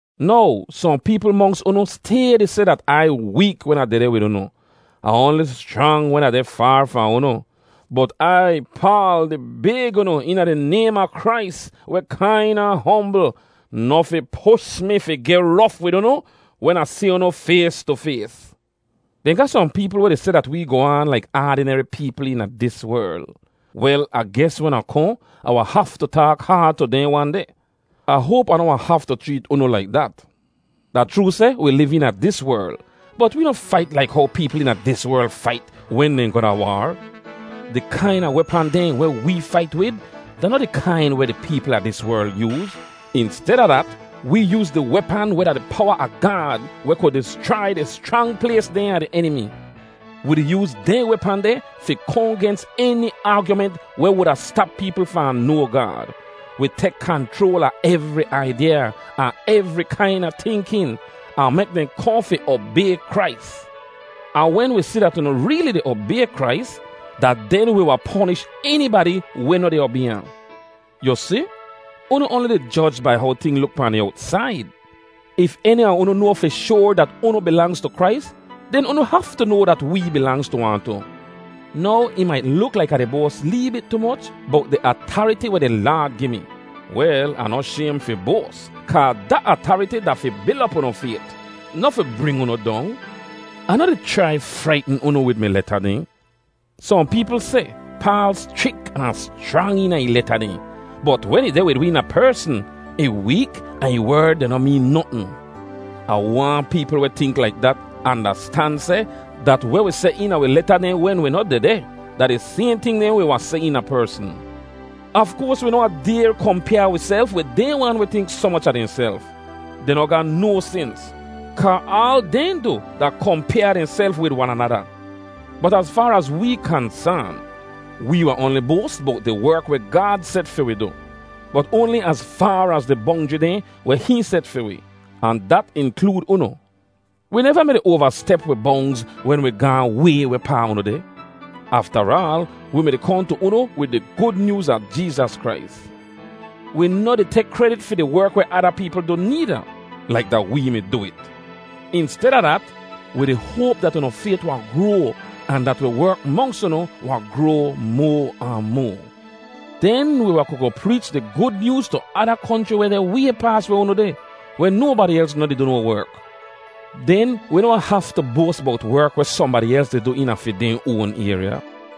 Now, sohn peepl monks unu stay di seh dat Ai week wen Ah dehdeh wid unu, ahn oanli schrang wen Ah deh faar fahn unu. Bot Ai, Paal, di bayg unu eena di naym a Krais, weh kain ahn hombl, noh fi push mi fi geh rof wid unu wen Ah si unu fays tu fays. Dehn ga sohn peepl weh di seh dat wee goh aan laik aadineri peepl eena dis werl. Wel, Ah ges wen Ah kohn, Ah wahn haftu taak haad tu dehn wan deh. Ah hoap Ah noh wahn haftu chreet unu laik dat. Da chroo seh wi liv eena dis werl, bot wee noh fait laik how peepl eena dis werl fait wen dehn goh da waar. Di kaina wepan dehn weh wee fait wid da noh di kain weh di peepl a dis werl yooz. Insteda dat, wee yooz di wepan weh da di powa a Gaad weh ku dischrai di schrang plays dehn a di enimi. Wi di yooz dehn wepan deh fi kohn gens eni aagyument weh wuda stap peepl fahn noa Gaad. Wi tek kanchroal a evri aidyaa ahn evri kaina tinkin, ahn mek dehn kohn fi obay Krais. Ahn wen wi si dat unu reeli di obay Krais, da den wi wahn ponish enibadi weh noh di obay ahn. Yu si, unu oanli di joj bai how ting luk pahn di owtsaid. If eni a unu noa fi shoar dat unu bilangz tu Krais, den unu haftu noa dat wee bilangz tu ahn tu. Now, ih mait luk laik Ah di boas lee bit tu moch bowt di atariti weh di Laad gi mi. Wel, Ah noh shaym fi boas, kaa da atariti da fi bil op unu fayt, noh fi bring unu dong. Ah noh di chrai fraitn unu wid mi leta dehn. Sohn peepl seh, “Paal schrik ahn schrang eena ih leta dehn, bot wen ih deh wid wi eena persn, ih week ahn ih werd dehn noh meen notn.” Ah waahn peepl weh tink laik dat andastan seh dat weh wi seh eena wi leta dehn wen wi noh dehdeh, da di sayhn ting dehn wi wahn seh eena persn. Af koars wi noh wahn dayr kompyaa wiself wid dehn wan weh tink soh moch a dehnself. Dehn noh ga no sens, kaa aal dehn du da kompyaa dehnself wid wan anada. Bot az faar az wee kansaan, wee wahn oanli boas bowt di werk weh Gaad set fi wi du, bot oanli az faar az di bongjri dehn weh hihn set fi wi, ahn dat inklood unu. Wi neva mi-di oavastep wi bongz wen wi gaahn way wehpaa unu deh. Aftaraal, wi mi did kohn tu unu wid di Gud Nyooz a Jeezas Krais. Wi noh di tek kredit fi di werk weh ada peepl du needa, laik da wee mi du it. Insteda dat, wi di hoap dat unu fayt wahn groa ahn dat wi werk monks unu wahn groa moa ahn moa. Den wi wahn ku goh preech di Gud Nyooz tu ada konchri weh deh way paas weh unu deh, weh nobadi els noh di du no werk. Den wi noh wahn haftu boas bowt werk weh sohnbadi els di du eena fi dehn oan ayrya.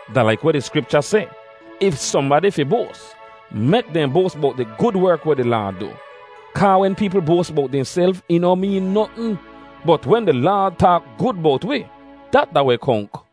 Da laik weh di Skripcha seh, “If sohnbadi fi boas, mek dehn boas bowt di gud werk weh di Laad du.” Kaa wen peepl boas bowt dehnself ih noh meen notn. Bot wen di Laad taak gud bowt wi, dat da weh konk.